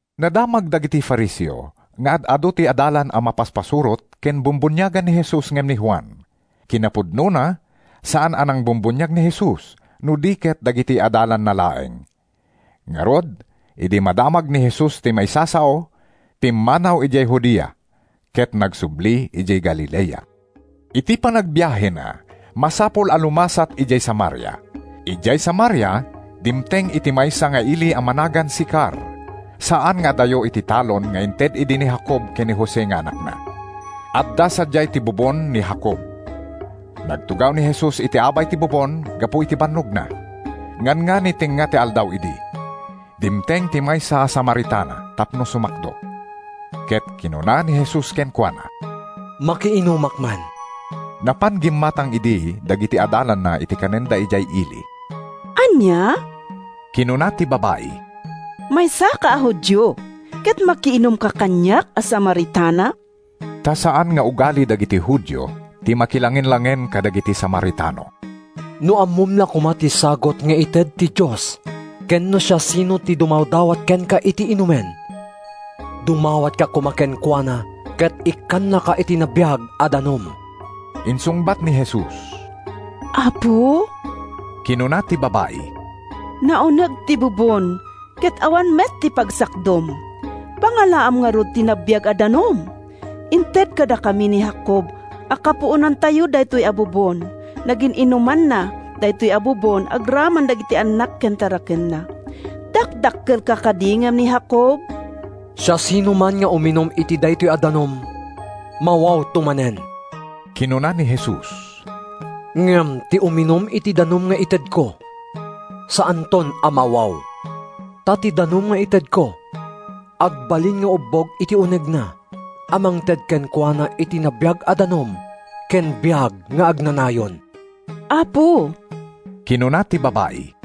Nadamag dagiti Fariseo nga ad-adu ti adalan a mapaspasurot ken bumbuniagan ni Jesus ngem ni Juan. (Kinapudnona, saan a nangbumbuniag ni Jesus, no di ket dagiti adalanna laeng.) Ngarud, idi madamag ni Jesus ti maisasao, pimmanaw idiay Judea ket nagsubli idiay Galilea. Iti panagbiahena, masapul a lumasat idiay Samaria. Idiay Samaria, dimteng iti maysa nga ili a managan Sicar, a saan nga adayo iti talon nga inted idi ni Jacob ken ni Jose nga anakna. Adda sadiay ti bubon ni Jacob. Nagtugaw ni Jesus iti abay ti bubon gapu iti bannogna. Nganngani tengnga ti aldaw idi. Dimteng ti maysa a Samaritana tapno sumakdo, ket kinuna ni Jesus kenkuana, “Makiinumak man.” ( Napan gimmatang idi dagiti adalanna iti kanenda idiay ili.) “Ania?” kinuna ti babai. “Maysaka a Judio, ket makiinumka kaniak a Samaritana?” (Ta saan nga ugali dagiti Judio ti makilangenlangen kadagiti Samaritano.) “No ammom la koma ti sagut nga ited ti Dios ken no siasino ti dumawdawat kenka iti inumen, dumawatka koma kenkuana ket ikkannaka iti nabiag a danum,” insungbat ni Jesus. “Apo,” kinuna ti babai, “nauneg ti bubon ket awan met ti pagsakdum. Pangalaam ngarud iti nabiag a danum? Inted kadakami ni Jacob a kapuonantayo daytoy a bubon. Nagin-inumanna daytoy a bubon agraman dagiti annak ken tarakenna. Dakdakkelka kadi ngem ni Jacob?” “Siasinoman nga uminum iti daytoy a danum, mawawto manen,” kinuna ni Jesus, “ngem ti uminum iti danum nga itedko, saanton a mawaw. Ta ti danum nga itedko agbalinto nga ubbog iti unegna a mangted kenkuana iti nabiag a danum ken biag nga agnanayon.” “Apo,” kinuna ti babai,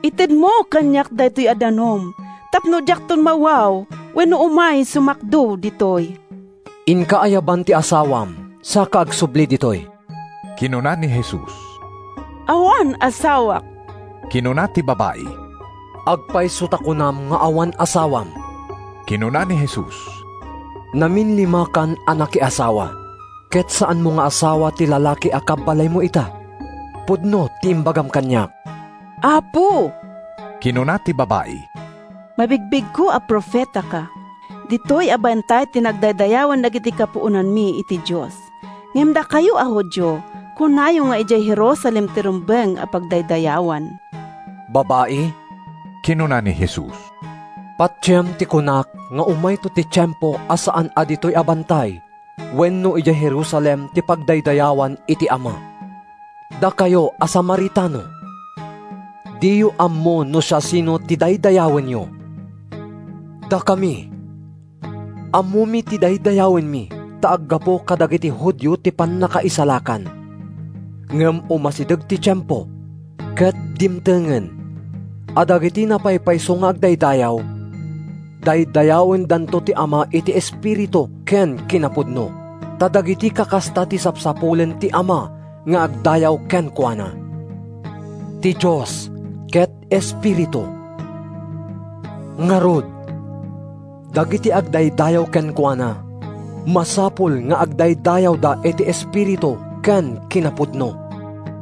“itedmo kaniak daytoy a danum tapno diakton mawaw wenno umay sumakdo ditoy.” “Inka ayaban ti asawam saka agsubli ditoy,” kinuna ni Jesus. “Awan asawak,” kinuna ti babai. “Agpayso ta kunam nga awan asawam,” kinuna ni Jesus. “Naminlimakan a nakiasawa, ket saanmo nga asawa ti lalaki a kabbalaymo ita. Pudno ti imbagam kaniak.” “Apo,” kinuna ti babai, “mabigbigko a profetaka. Ditoy a bantay ti nagdaydayawan dagidi kapuonanmi iti Dios. Ngem dakayo a Judio kunayo nga idiay Jerusalem ti rumbeng a pagdaydayawan.” “Babai,” kinuna ni Jesus, “patiem ti kunak nga umayto ti tiempo a saan a ditoy a bantay wenno idiay Jerusalem ti pagdaydayawan iti Ama. Dakayo a Samaritano, diyo ammo no siasino ti daydayawenyo. Dakami, ammomi ti daydayawenmi ta aggapu kadagiti Judio ti pannakaisalakan. Ngem umasideg ti tiempo, ket dimtengen, a dagiti napaypayso nga agdaydayaw, daydayawendanto ti Ama iti espiritu ken kinapudno. Ta dagiti kakasta ti sapsapulen ti Ama nga agdayaw kenkuana. Ti Dios ket Espiritu. Ngarud, dagiti agdaydayaw kenkuana masapul nga agdaydayawda iti Espiritu ken kinapudno.”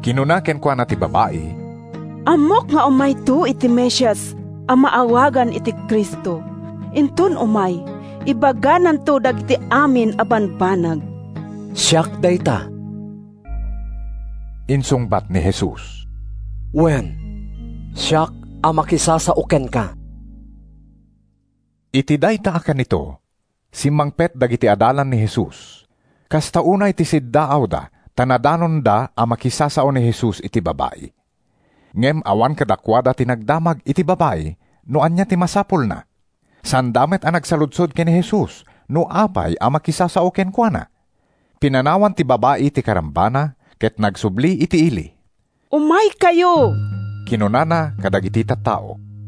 Kinuna kenkuana ti babai, “Ammok nga umayto ti Mesias a maawagan iti Cristo. Inton umay, ibagananto dagiti amin a bambanag.” “Siak dayta,” insungbat ni Jesus. “Wen, siak a makisasao kenka.” Iti dayta a kanito, simmangpet dagiti adalan ni Jesus. Kasta unay ti siddaawda ta nadanonda a makisasao ni Jesus iti babai. Ngem awan kadakuada ti nagdamag iti babai no ania ti masapulna. Saanda met a nagsaludsod ken ni Jesus no apay a makisasao kenkuana. Pinanawan ti babai ti karambana ket nagsubli iti ili. “Umaykayo!” kinunana kadagiti tattao.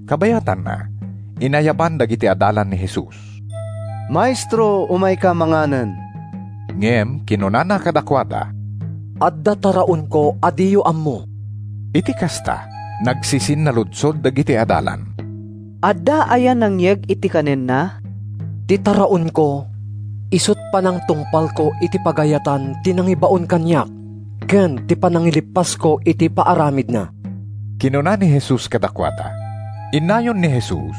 Kabayatanna, inayaban dagiti adalan ni Jesus, “Maestro, umayka manganen!” Ngem kinunana kadakuada, “Adda taraonko a diyo ammo.” Iti kasta, nagsisinnaludsod dagiti adalan, “Adda aya nangyeg iti kanenna?” “Ti taraonko isut’ panangtungpalko iti pagayatan ti nangibaon kaniak ken ti panangileppasko iti paaramidna,” kinuna ni Jesus kadakuada. Innayon ni Jesus: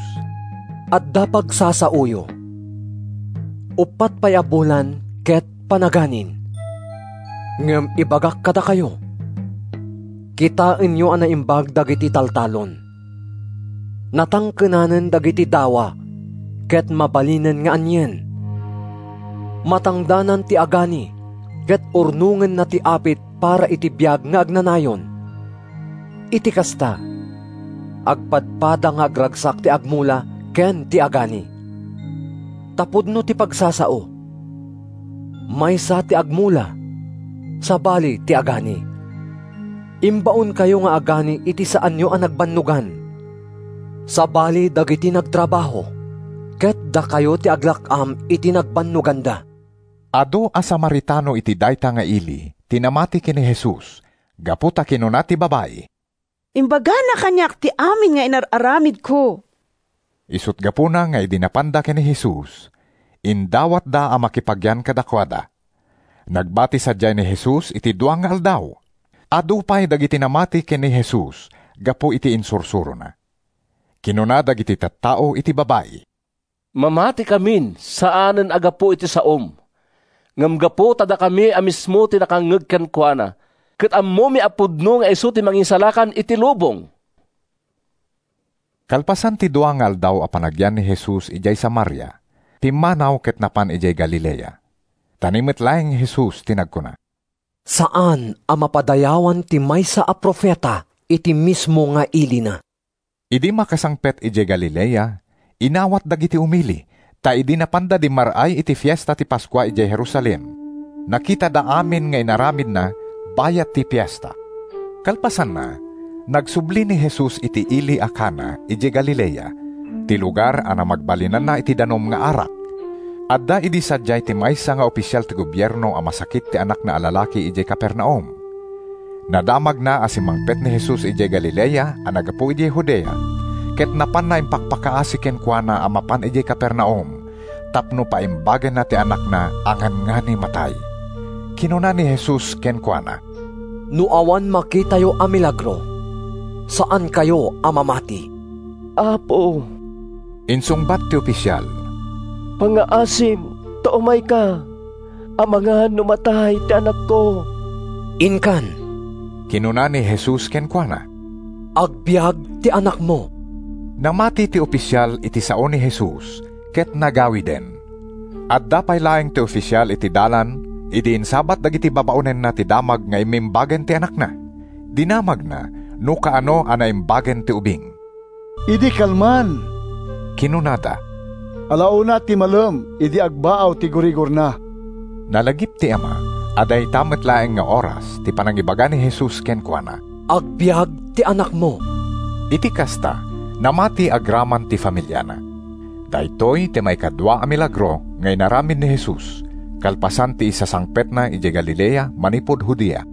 “Adda pagsasaoyo, ‘Uppat pay a bulan ket panaganin.’ Ngem ibagak kadakayo, kitaenyo a naimbag dagiti taltalon. Natangkenanen dagiti dawa ket mabalinen nga anien! Matangdanan ti agani ket urnongenna ti apit para iti biag nga agnanayon. Iti kasta, agpadpada nga agragsak ti agmula ken ti agani. Ta pudno ti pagsasao: ‘Maysa ti agmula, sabali ti agani.’ Imbaonkayo nga agani iti saanyo a nagbannogan. Sabali dagiti nagtrabaho, ket dakayo ti aglak-am iti nagbannoganda.” Adu a Samaritano iti dayta nga ili ti namati ken ni Jesus gapu ta kinuna ti babai: “Imbagana kaniak ti amin nga inar-aramidko.” Isut’ gapuna nga idi napanda ken ni Jesus, indawatda a makipagyan kadakuada. Nagbati sadiay ni Jesus iti dua nga aldaw. Adu pay dagiti namati ken ni Jesus gapu iti insursurona. Kinuna dagiti tattao iti babai, “Mamatikamin, saanen a gapu iti saom, ngem gapu ta dakami a mismo ti nakangngeg kenkuana, ket ammomi a pudno nga isu ti Mangisalakan iti lubong.” Kalpasan ti dua nga aldaw a panagyan ni Jesus idiay Samaria, pimmanaw ket napan idiay Galilea. Ta ni met laeng Jesus ti nagkuna, “Saan a mapadayawan ti maysa a profeta iti mismo nga ilina.” Idi makasangpet idiay Galilea, inawat dagiti umili, ta idi napanda dimmar-ay iti Fiesta ti Paskua idiay Jerusalem, nakitada amin nga inaramidna bayat ti Fiesta. Kalpasanna, nagsubli ni Jesus iti ili a Cana idiay Galilea, ti lugar a namagbalinanna iti danum nga arak. Adda idi sadiay ti maysa nga ofisial ti gobierno a masakit ti anakna a lalaki idiay Capernaum. Nadamagna a simmangpet ni Jesus idiay Galilea a naggapu idiay Judea, ket napanna impakpakaasi kenkuana a mapan idiay Capernaum tapno paimbagenna ti anakna a nganngani matay. Kinuna ni Jesus kenkuana, “No awan makitayo a milagro, saankayo a mamati.” “Apo,” insungbat ti ofisial, “pangngaasim ta umayka amangan no matay ti anakko.” “Inkan,” kinuna ni Jesus kenkuana. “Agbiag ti anakmo!” Namati ti ofisial iti sao ni Jesus ket nagawiden. Adda pay laeng ti ofisial iti dalan idi insabat dagiti babaonenna ti damag nga immimbagen ti anakna. Dinamagna no kaano a naimbagen ti ubing. “Idi kalman!” kinunada. “Ala una iti malem idi agbaaw ti gurigorna.” Nalagip ti ama a dayta met laeng nga oras ti panangibaga ni Jesus kenkuana: “Agbiag ti anakmo.” Iti kasta, namati agraman ti familiana. Daytoy ti maikadua a milagro nga inaramid ni Jesus kalpasan ti isasangpetna idiay Galilea manipud Judea.